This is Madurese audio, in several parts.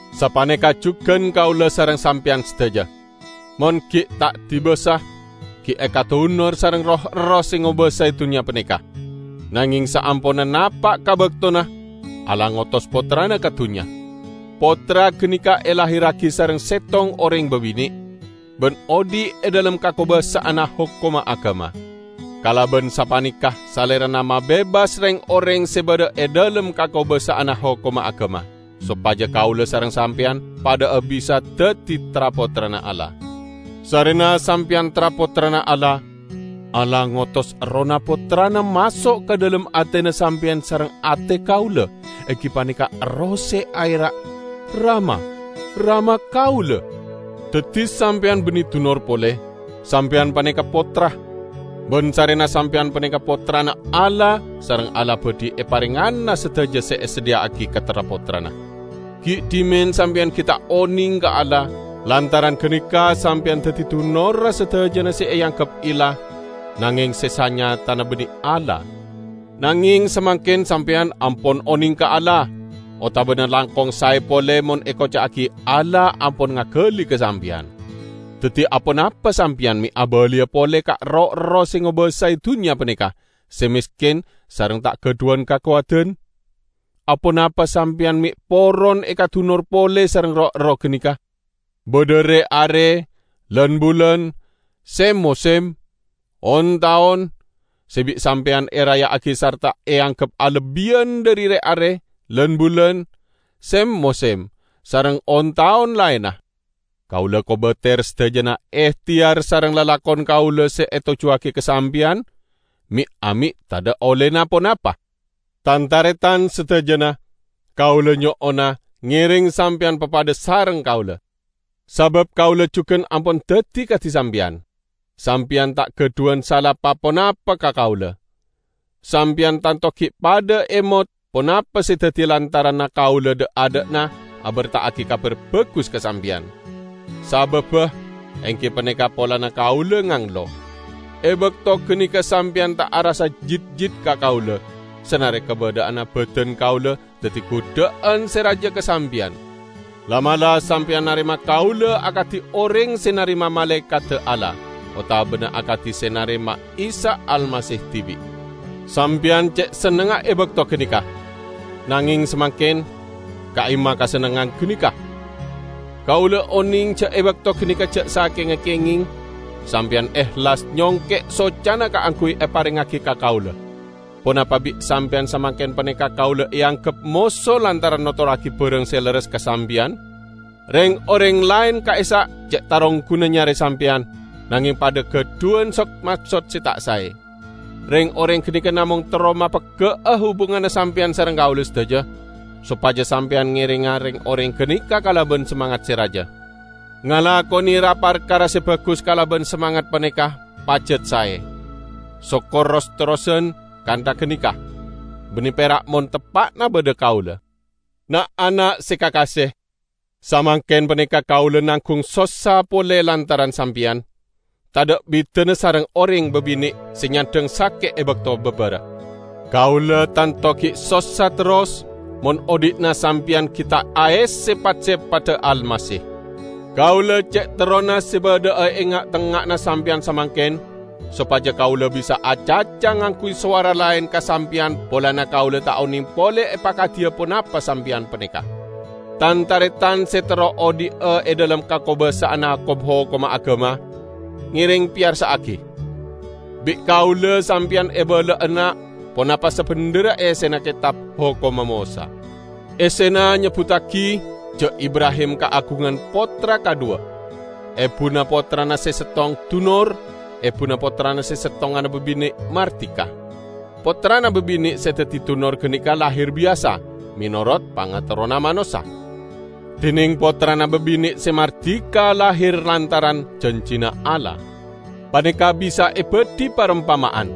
Sapaneka jugan kaula sareng sampeyan sadaja: Mon gi' ta' dibasa, gi' ekadunor sareng roh-erroh se ngobasae dunnya paneka. Nangeng saamponna napa' ka baktona, Allah ngotos Pottrana ka dunnya. Pottra ganeka elahirragi sareng settong oreng babine', ban odhi' e dhalem kakobasa'anna hokomma agama. Kalaban sapaneka Salerana mabebas reng-oreng se badha e dhalem kakobasa'anna hokomma agama; sopaja kaula sareng sampeyan padha'a bisa daddi tra-pottrana Allah. Sarrena sampeyan tra-pottrana Allah, Allah ngotos Errohna Pottrana maso' ka dhalem atena sampeyan sareng ate kaula, enggi paneka Erroh se aera', "Rama, Rama kaula." Daddi sampeyan banne dunor pole, sampeyan paneka pottra. Ban sarrena sampeyan paneka pottrana Allah, sareng Allah badhi eparengngana sadaja se esadhiya'agi ka tra-pottrana. Gi' dhimen sampeyan gi' ta' oneng ka Allah, lantaran ganeka sampeyan daddi dunorra sadajana se eanggep illah nangeng se sanyatana banne Allah. Nangeng samangken sampeyan ampon oneng ka Allah, otabana langkong sae pole mon ekoca'agi Allah ampon ngagali ka sampeyan. Daddi aponapa sampeyan me' abaliya pole ka roh-erroh se ngobasae dunnya paneka, se mesken sareng ta' gadhuwan kakowadan? Aponapa sampeyan me' poron ekadunor pole sareng roh-erroh ganeka? Badha re-are, lan-bulan, sem-mosem, on-taon, se bi' sampeyan eraya'agi sarta eanggep alebbiyan dhari re-are, lan-bulan, sem-mosem, sareng on-taon laenna. Kaula kobater sadajana ehteyar sareng lalakon kaula se etojjuwagi ka sampeyan me'-ame' tadha' ollena ponapa. Tan-taretan sadajana, kaula nyo'ona, ngereng sampeyan papadha sareng kaula. Sabab kaula jugan ampon daddi kadi sampeyan. Sampeyan ta' gadhuwan sala pa-ponapa ka kaula. Sampeyan tanto gi' padha emot ponapa se daddi lantaranna kaula dha'-adha'na aberta'agi Kabar Bagus ka sampeyan. Sababba, enggi paneka polana kaula nganglo. E bakto ganeka sampeyan ta' arassa jitjit ka kaula, sanare kabadha'anna badan kaula daddi gudha'an se raja ka sampeyan. La'-mala' sampeyan narema kaula akadi oreng se narema malaekadda Allah, otabana akadi se narema Isa Almasih dibi'. Sampeyan ce' sennengnga e bakto ganeka. Nangeng samangken, ka'imma kasennengngan ganeka? Kaula oneng ja' e bakto ganeka ja' sakenga kengeng, sampeyan ehlas nyongke' socana kaangguy eparengngagi ka kaula. Ponapa bi' sampeyan samangken paneka kaula eanggep moso lantaran notorragi barang se lerres ka sampeyan? Reng-oreng laen ka'issa' ce' tarongguna nyare sampeyan, nangeng padha gadhuwan sod-maksod se ta' sae. Reng-oreng ganeka namong terro mapegga'a hubunganna sampeyan sareng kaula sadaja, sopaja sampeyan ngerenga reng-oreng ganeka kalaban samangat se raja. Ngalakone ra-parkara se bagus kalaban samangat paneka pajat sae, sokor ros-terrosan kantha ganeka, banne pera' mon teppa'na badha kaula. Na'-ana' se kakase! Samangken paneka kaula nanggung sossa pole lantaran sampeyan, tadha' bidana sareng oreng babine' se nyandhang sake' e bakto babara. Kaula tanto gi' sossa terros, mon odhi'na sampeyan gi' ta' aesse pat-sepadda Almasih! Kaula ce' terrona se badha'a e nga'-tengnga'anna sampeyan samangken, sopaja kaula bisa acaca ngangguy sowara laen ka sampeyan polana kaula ta' oneng pole epakadiya ponapa sampeyan paneka! Tan-taretan se terro odhi'a e dhalem kakobasa'anna kom-hokomma agama, ngereng peyarsa'agi! Bi' kaula sampeyan ebala'ana ponapa sabendherra essena Ketab Hokomma Mosa. Essena nyebbuttagi ja' Ibrahim kaagungan pottra kadhuwa; ebuna pottrana se settong dunor, ebuna pottrana settonganna babine' mardika. Pottrana babine' se daddi dunor ganeka lahir biyasa, menorot pangaterrona manossa. Dineng pottrana babine' se mardika lahir lantaran janjina Allah. Paneka bisa ebadhi parompama'an.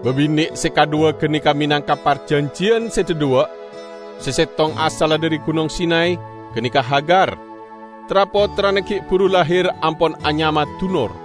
Babine' se kadhuwa ganeka menangka parjanjiyan se dhadhuwa': se settong asalla dhari Gunong Sinay -- ganeka Hagar: tra-pottrana gi' buru lahir ampon anyama dunor.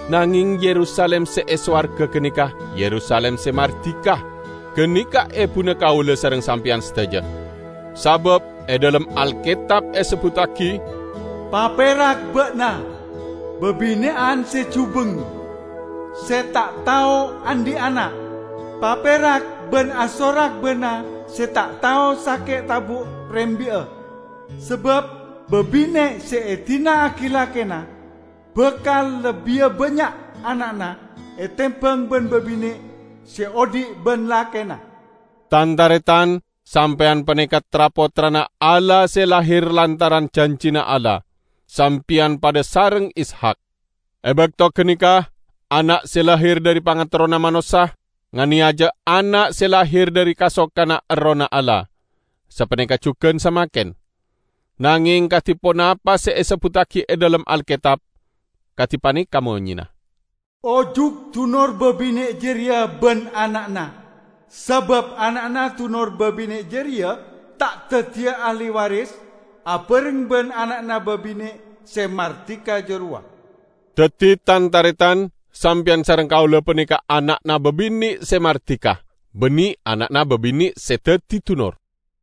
Nangeng Yerusalim se e sowarga ganeka Yerusalim se mardika, ganeka ebuna kaula sareng sampeyan sadaja. Sabab e dhalem Alketab esebbuttagi, "Paperak ba'na, babine'an se jubeng, se ta' tao andhi' ana'! Paperak ban asorak ba'na se ta' tao sake' tabu' rembi'a! Sabab babine' se edina'agi lakena bakal lebbiya bannya' ana'na etembang ban babine' se odhi' ban lakena." Tan-taretan! Sampeyan paneka tra-pottrana Allah se lahir lantaran janjina Allah: sampeyan padha sareng Ishak. E bakto ganeka ana' se lahir dhari pangaterrona manossa, nganeyaja ana' se lahir dhari kasokanna Errohna Allah. Sapaneka jugan samangken. Nangeng kadi ponapa se esebbuttagi e dhalem Alketab? Kadi paneka monyena, "Ojuk dunor babine' jareya ban ana'na, sabab ana'na dunor babine' jareya ta' daddiya ahli waris abareng ban ana'na babine' se mardika jarowa." Daddi, tan-taretan, sampeyan sareng kaula paneka ana'na babine' se mardika, banne ana'na babine' se daddi dunor.